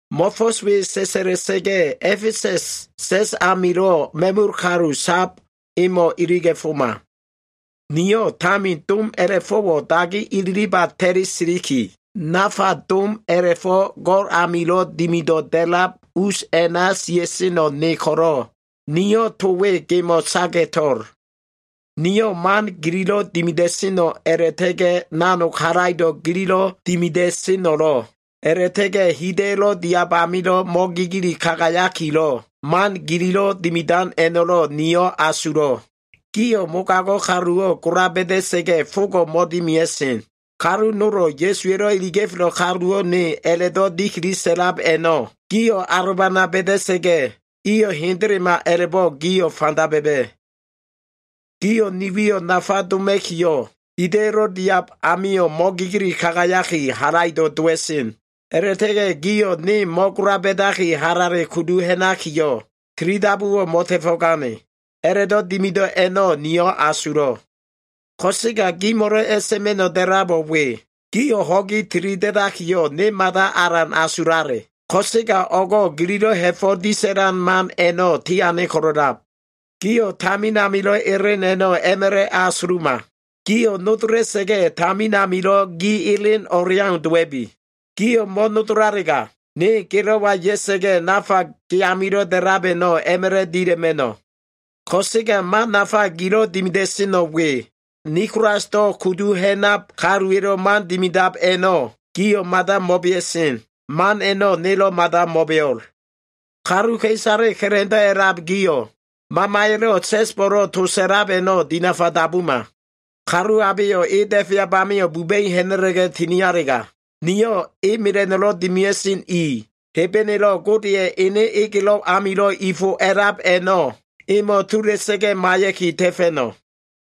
“Mo꞉fo꞉s we sa꞉sa꞉la꞉sa꞉ga꞉ A꞉fesa꞉s sa꞉s amilo꞉ ma꞉mul kalu sab emo꞉ iliga꞉foma. Niyo꞉ tamin dom a꞉la꞉fo꞉wo꞉ dagi ililiba ta꞉li siliki, nafa dom a꞉la꞉fo꞉ go꞉l amilo꞉ dimido꞉ da꞉lab us a꞉na sia꞉seno꞉ ne ko꞉lo꞉, niyo꞉ to we gemo꞉ saga꞉to꞉l. Niyo꞉ man gililo꞉ dimida꞉seno꞉ a꞉la꞉ta꞉ga꞉ nanog halaido꞉ gililo꞉ dimida꞉seno꞉lo꞉, a꞉la꞉ta꞉ga꞉ hida꞉yo꞉lo꞉ diab amilo꞉ mo꞉gigili kagayakilo꞉ man gililo꞉ dimidan a꞉no꞉lo꞉, niyo꞉ asulo꞉. Gio꞉ mogago꞉ kaluwo꞉ gola ba꞉da꞉sa꞉ga꞉ fogo꞉ mo꞉dimia꞉sen. Kalu nolo꞉ ‘Ya꞉suwa꞉lo꞉ iliga꞉felo꞉ kalu nowo꞉ ne’ a꞉la꞉do꞉ dikili sa꞉lab a꞉no꞉ gio꞉ alobana ba꞉da꞉sa꞉ga꞉, iyo꞉ hendelema a꞉la꞉bo꞉ gio꞉ fanda ba꞉ba꞉. Gio꞉ ni wiyo꞉ nafa doma꞉kiyo꞉, hida꞉yo꞉lo꞉ diab amio꞉ mo꞉gigili kagayaki, halaido꞉ dowa꞉sen. A꞉la꞉ta꞉ga꞉ gio꞉ ne mo꞉gola ba꞉daki, halale kudu ha꞉nakiyo꞉, tilidabuwo꞉ mo꞉ta꞉fo꞉gane. A꞉la꞉do꞉ dimido꞉ a꞉no꞉ niyo꞉ asulo꞉. Ko꞉sega gimo꞉lo꞉ a꞉sa꞉ma꞉no꞉ da꞉labo꞉ we. Gio꞉ ho꞉gi tilida꞉dakiyo꞉, ne mada alan asulale, ko꞉sega o꞉go꞉ gililo꞉ ha꞉fo꞉ disa꞉lan man a꞉no꞉ tiane ko꞉lo꞉lab. Gio꞉ tamin amilo꞉ elen a꞉no꞉ a꞉ma꞉la꞉ a꞉asuluma. Gio꞉ nodola꞉sa꞉ga꞉, tamin amilo꞉ gi elen o꞉leau dowa꞉bi. Gio꞉ mo꞉nodolalega, ne gelo꞉wa ya꞉sa꞉ga꞉ nafa ge amilo꞉ da꞉lab a꞉no꞉ a꞉ma꞉la꞉ dila꞉ma꞉no꞉. Ko꞉sega man nafa gilo꞉ dimida꞉seno꞉ we. Nikolasdo kudu ha꞉nab kaluwa꞉lo꞉ man dimidab a꞉no꞉ gio꞉ mada mo꞉bea꞉sen. Man a꞉no꞉ nelo꞉ mada mo꞉beo꞉l. Kaluka꞉isale ka꞉la꞉ndo꞉ a꞉lab gio꞉ Mamaya꞉lo꞉ sa꞉sbo꞉lo꞉ to sa꞉lab a꞉no꞉ dinafa dabuma. Kalu abeyo꞉ e da꞉feab amio꞉ buba꞉i ha꞉na꞉la꞉ga꞉ tinialega, niyo꞉ e mela꞉no꞉lo꞉ dimia꞉sen i, Hebenelo꞉ Godeya꞉ ene egelo꞉ amilo꞉ i fo a꞉lab a꞉no꞉ emo꞉ tula꞉sa꞉ga꞉ maiya꞉ki ta꞉fa꞉no꞉.”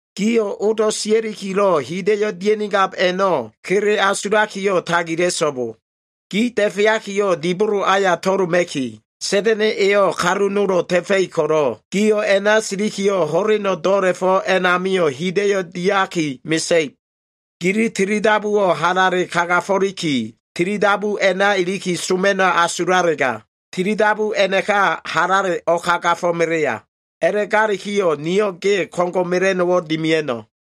Gio꞉ odo꞉ siakilo꞉ hida꞉yo꞉ dia꞉nigab a꞉no꞉ kele asulakiyo꞉ tagila꞉so꞉bo. Gi da꞉feakiyo꞉, dibolo aya to꞉loma꞉ki, Sa꞉da꞉na꞉ eyo꞉ kalu nolo꞉ ta꞉fa꞉ib ko꞉lo꞉, gio꞉ a꞉na silikiyo꞉ ho꞉leno꞉ do꞉la꞉fo꞉ a꞉namio꞉ hida꞉yo꞉ diaki mesa꞉ib. Gili tilidabuwo꞉ halale kagafo꞉liki, tilidabu a꞉na iliki soma꞉no꞉ a꞉la꞉asulalega, tilidabu a꞉naka halale o꞉kagafomelea. A꞉la꞉galikiyo꞉ niyo꞉ ge ko꞉ngo꞉ mela꞉no꞉wo꞉ dimia꞉no꞉.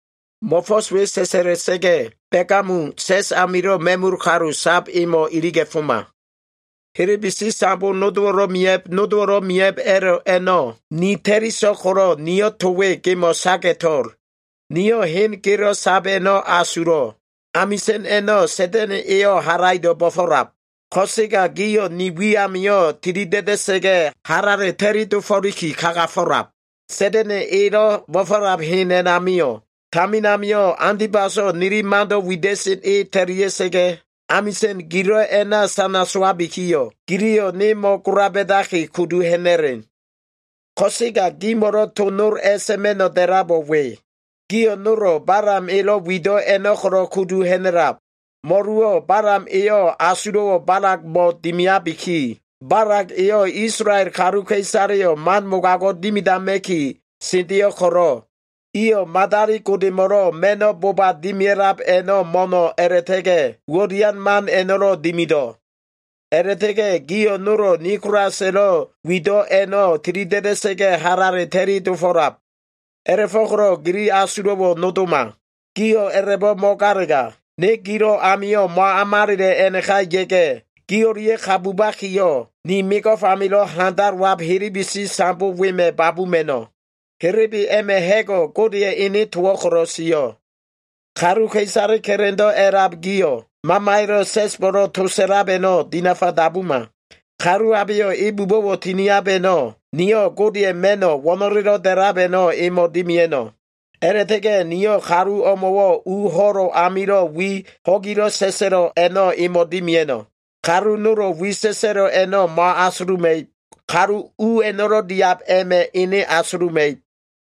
“Mo꞉fo꞉s we sa꞉sa꞉la꞉sa꞉ga꞉, Begamum sa꞉s amilo꞉ ma꞉mul kalu sab emo꞉ iliga꞉foma. Helebesi sambo nodowo꞉lo꞉ miya꞉b, nodowo꞉lo꞉ miya꞉b a꞉lo꞉ a꞉no꞉ ni ta꞉li so꞉l ko꞉lo꞉, niyo꞉ to we gemo꞉ saga꞉to꞉l. Niyo꞉ hen gelo꞉ sab a꞉no꞉ asulo꞉. Amisa꞉n a꞉no꞉ Sa꞉da꞉na꞉ eyo꞉ halaido꞉ bo꞉fo꞉lab. Ko꞉sega gio꞉ ni wi amio꞉ tilida꞉da꞉sa꞉ga꞉, halale ta꞉li dofo꞉liki kagafo꞉lab. Sa꞉da꞉na꞉ elo꞉ bo꞉fo꞉lab hen a꞉namio꞉, tamin amio꞉ Antibaso꞉ nili mando꞉ wida꞉sen e ta꞉lia꞉sa꞉ga꞉, amisa꞉n gilo꞉ a꞉na sana sowabikiyo꞉, giliyo꞉ ne mo꞉gola ba꞉daki kudu ha꞉na꞉len. Ko꞉sega gimo꞉lo꞉ to nol a꞉sa꞉ma꞉no꞉ da꞉labo꞉ we. Gio꞉ nolo꞉ Balam elo꞉ wido꞉ a꞉no꞉ ko꞉lo꞉ kudu ha꞉na꞉lab. Mo꞉luwo꞉ Balam eyo꞉ asulo꞉wo꞉ Balagmo꞉ dimiabiki, Balag eyo꞉ Isolael kaluka꞉isaleyo꞉ man mogago꞉ dimidama꞉kiyo꞉ sendeyo꞉ ko꞉lo꞉, iyo꞉ madali godemo꞉lo꞉ ma꞉no꞉ boba dimia꞉lab a꞉no꞉ mo꞉no꞉ a꞉la꞉ta꞉ga꞉ uwo꞉ dian man a꞉no꞉lo꞉ dimido꞉. A꞉la꞉ta꞉ga꞉ gio꞉ nolo꞉ Nikolasa꞉lo꞉ wido꞉ a꞉no꞉ tilida꞉da꞉sa꞉ga꞉ halale ta꞉li dofo꞉lab. A꞉la꞉fo꞉ko꞉lo꞉ gili asulo꞉wo꞉ nodoma. Gio꞉ a꞉la꞉bo꞉ mo꞉galega, ne gilo꞉ amio꞉ mo꞉amalela꞉ a꞉naka ya꞉ga꞉, gi o꞉lia꞉ ka bubakiyo꞉, ni mego꞉f amilo꞉ handalowab helebesi sambo wema꞉ babuma꞉no꞉. Helebe a꞉ma꞉ ha꞉go꞉ Godeya꞉ ene towo꞉ ko꞉lo꞉ sio꞉. Kaluka꞉isale ka꞉la꞉ndo꞉ a꞉lab gio꞉, Mamaya꞉lo꞉ sa꞉sbo꞉lo꞉ to sa꞉lab a꞉no꞉ dinafa dabuma. Kalu abeyo꞉ e bubo꞉wo꞉ tiniab a꞉no꞉, niyo꞉ Godeya꞉ ma꞉no꞉ wo꞉no꞉lelo꞉ da꞉lab a꞉no꞉ emo꞉ dimia꞉no꞉. A꞉la꞉ta꞉ga꞉ niyo꞉ kalu o꞉mo꞉wo꞉ u ho꞉lo꞉ amilo꞉ wi ho꞉gilo꞉ sa꞉sa꞉lo꞉ a꞉no꞉ dimia꞉no꞉. Kalu nolo꞉ wi sa꞉sa꞉lo꞉ a꞉no꞉ mo꞉asuluma꞉ib. Kalu u a꞉no꞉lo꞉ diab a꞉ma꞉ ene asuluma꞉ib.”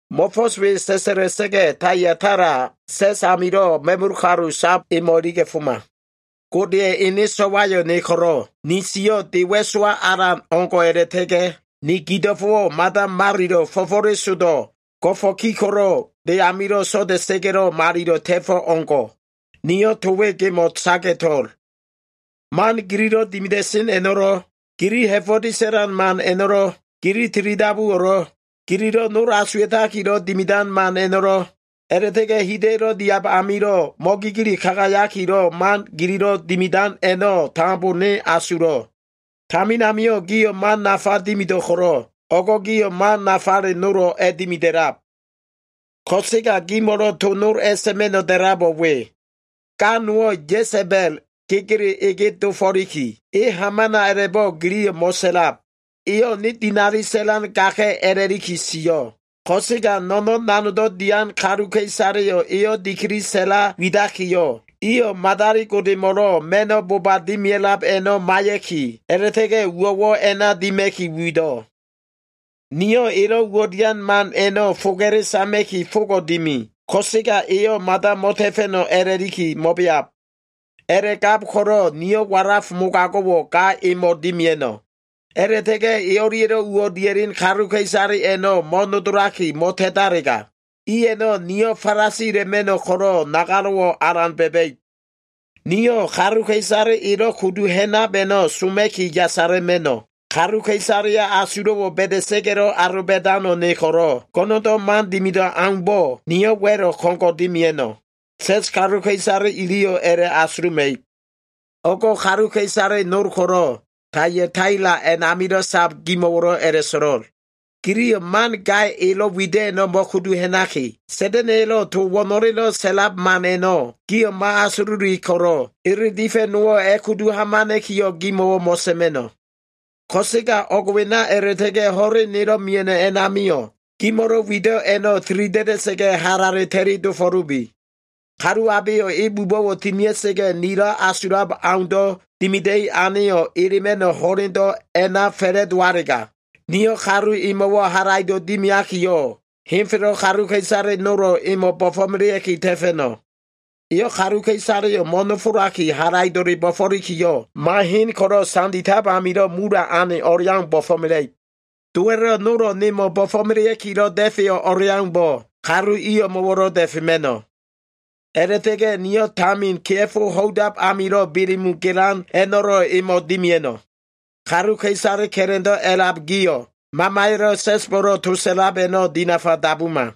“Mo꞉fo꞉s we sa꞉sa꞉la꞉sa꞉ga꞉ Taiataila sa꞉s amilo꞉ ma꞉mul kalu sab emo꞉ iliga꞉foma. Godeya꞉ ene So꞉wayo꞉ ne ko꞉lo꞉, ni siyo꞉ de wa꞉sowa alan o꞉ngo꞉ a꞉la꞉ta꞉ga꞉ ni gido꞉fo꞉wo꞉ mada malilo꞉ fo꞉fo꞉lesodo꞉, go꞉fo꞉ ki ko꞉lo꞉ de amilo꞉ so꞉da꞉sa꞉ga꞉lo꞉, malilo꞉ ta꞉fo꞉ o꞉ngo꞉. Niyo꞉ to we gemo꞉ saga꞉to꞉l. Man gililo꞉ dimida꞉sen a꞉no꞉lo꞉, gili ha꞉fo꞉ disa꞉lan man a꞉no꞉lo꞉, gili tilidabuwo꞉lo꞉, gililo꞉ nol asuwa꞉takilo꞉ dimidan man a꞉no꞉lo꞉, a꞉la꞉ta꞉ga꞉ hida꞉yo꞉lo꞉ diab amilo꞉ mo꞉gigili kagayakilo꞉ man gililo꞉ dimidan a꞉no꞉ tambo ne asulo꞉. Tamin amio꞉ gio꞉ man nafa dimido꞉ ko꞉lo꞉, o꞉go꞉ gio꞉ man nafale nolo꞉ a꞉dimida꞉lab. Ko꞉sega gimo꞉lo꞉ to nol a꞉sa꞉ma꞉no꞉ da꞉labo꞉ we. Ga nowo꞉ Ya꞉sa꞉ba꞉l gegele ege dofo꞉liki, e hamana a꞉la꞉bo꞉ giliyo꞉ mo꞉sa꞉lab. Eyo꞉ ne dinali sa꞉lan gaka꞉ a꞉la꞉liki sio꞉. Ko꞉sega no꞉no꞉n nanogdo꞉ dian kaluka꞉isaleyo꞉ eyo꞉ dikili sa꞉la widakiyo꞉, iyo꞉ madali godemo꞉lo꞉ ma꞉no꞉ boba dimia꞉lab a꞉no꞉ maiya꞉ki, a꞉la꞉ta꞉ga꞉ uwo꞉wo꞉ a꞉na dima꞉ki wido꞉. Niyo꞉ elo꞉ uwo꞉ dian man a꞉no꞉ foga꞉le sama꞉ki fogo꞉ dimi, ko꞉sega eyo꞉ mada mo꞉ta꞉fa꞉no꞉ a꞉la꞉liki mo꞉beab. A꞉la꞉gab ko꞉lo꞉ niyo꞉ walaf mogago꞉wo꞉ ga emo꞉wo꞉ dimia꞉no꞉. A꞉la꞉ta꞉ga꞉ e o꞉lia꞉lo꞉ uwo꞉ dia꞉len kaluka꞉isale a꞉no꞉ mo꞉nodolaki mo꞉ta꞉talega, i a꞉no꞉ niyo꞉ falasila꞉ma꞉no꞉ ko꞉lo꞉ nagalo꞉wo꞉ alan ba꞉ba꞉ib. Niyo꞉ kaluka꞉isale elo꞉ kudu ha꞉nab a꞉no꞉ soma꞉ki yasala꞉ma꞉no꞉. Kaluka꞉isaleya꞉ asulo꞉wo꞉ ba꞉da꞉sa꞉ga꞉lo꞉ aloba꞉dano꞉ ne ko꞉lo꞉, go꞉no꞉ndo꞉ man dimido꞉ aumbo꞉, niyo꞉ wa꞉lo꞉ ko꞉ngo꞉ dimia꞉no꞉. Sa꞉s kaluka꞉isale iliyo꞉ a꞉la꞉asuluma꞉ib. O꞉go꞉ kaluka꞉isale nol ko꞉lo꞉ Taiataila a꞉namilo꞉ sab gimo꞉wo꞉lo꞉ a꞉la꞉so꞉lo꞉l. Giliyo꞉ man ga elo꞉ wido꞉ a꞉no꞉ mo꞉kudu ha꞉naki, Sa꞉da꞉na꞉ya꞉lo꞉ to wo꞉no꞉le sa꞉lab man a꞉no꞉ gio꞉ mo꞉asululi ko꞉lo꞉, ele difa꞉ nowo꞉ a꞉kudu hamana꞉kiyo꞉ gimo꞉wo꞉ mo꞉sa꞉ma꞉no꞉. Ko꞉sega o꞉g wena a꞉la꞉ta꞉ga꞉ ho꞉len nelo꞉ mia꞉no꞉ a꞉namio꞉, gimo꞉lo꞉ wido꞉ a꞉no꞉ tilida꞉da꞉sa꞉ga꞉ halale ta꞉li dofo꞉lubi. Kalu abeyo꞉ e bubo꞉wo꞉ tinia꞉sa꞉ga꞉ nilo꞉ asulab aundo꞉ dimida꞉i aneyo꞉ elema꞉no꞉ ho꞉lendo꞉ a꞉na fa꞉la꞉dowalega, niyo꞉ kalu emo꞉wo꞉ halaido꞉ dimiakiyo꞉ henfelo꞉ kaluka꞉isale nolo꞉ emo꞉ bo꞉fo꞉melea꞉ki ta꞉fa꞉no꞉. ‘Eyo꞉ kaluka꞉isaleyo꞉ mo꞉nofolaki halaido꞉le bo꞉fo꞉likiyo꞉, ma hen ko꞉lo꞉ sanditab amilo꞉ mula꞉ ane o꞉leau bo꞉fo꞉mela꞉ib.’ Dowa꞉lo꞉ nolo꞉ nemo꞉ bo꞉fo꞉melea꞉kilo꞉ da꞉feyo꞉ o꞉leaumbo꞉, kalu i o꞉mo꞉wo꞉lo꞉ da꞉fema꞉no꞉. A꞉la꞉ta꞉ga꞉ niyo꞉ tamin kea꞉fo ho꞉idab amilo꞉ Belemu gelan a꞉no꞉lo꞉ emo꞉ dimia꞉no꞉. Kaluka꞉isale ka꞉la꞉ndo꞉ a꞉lab gio꞉ Mamaya꞉lo꞉ sa꞉sbo꞉lo꞉ to sa꞉lab a꞉no꞉ dinafa dabuma.”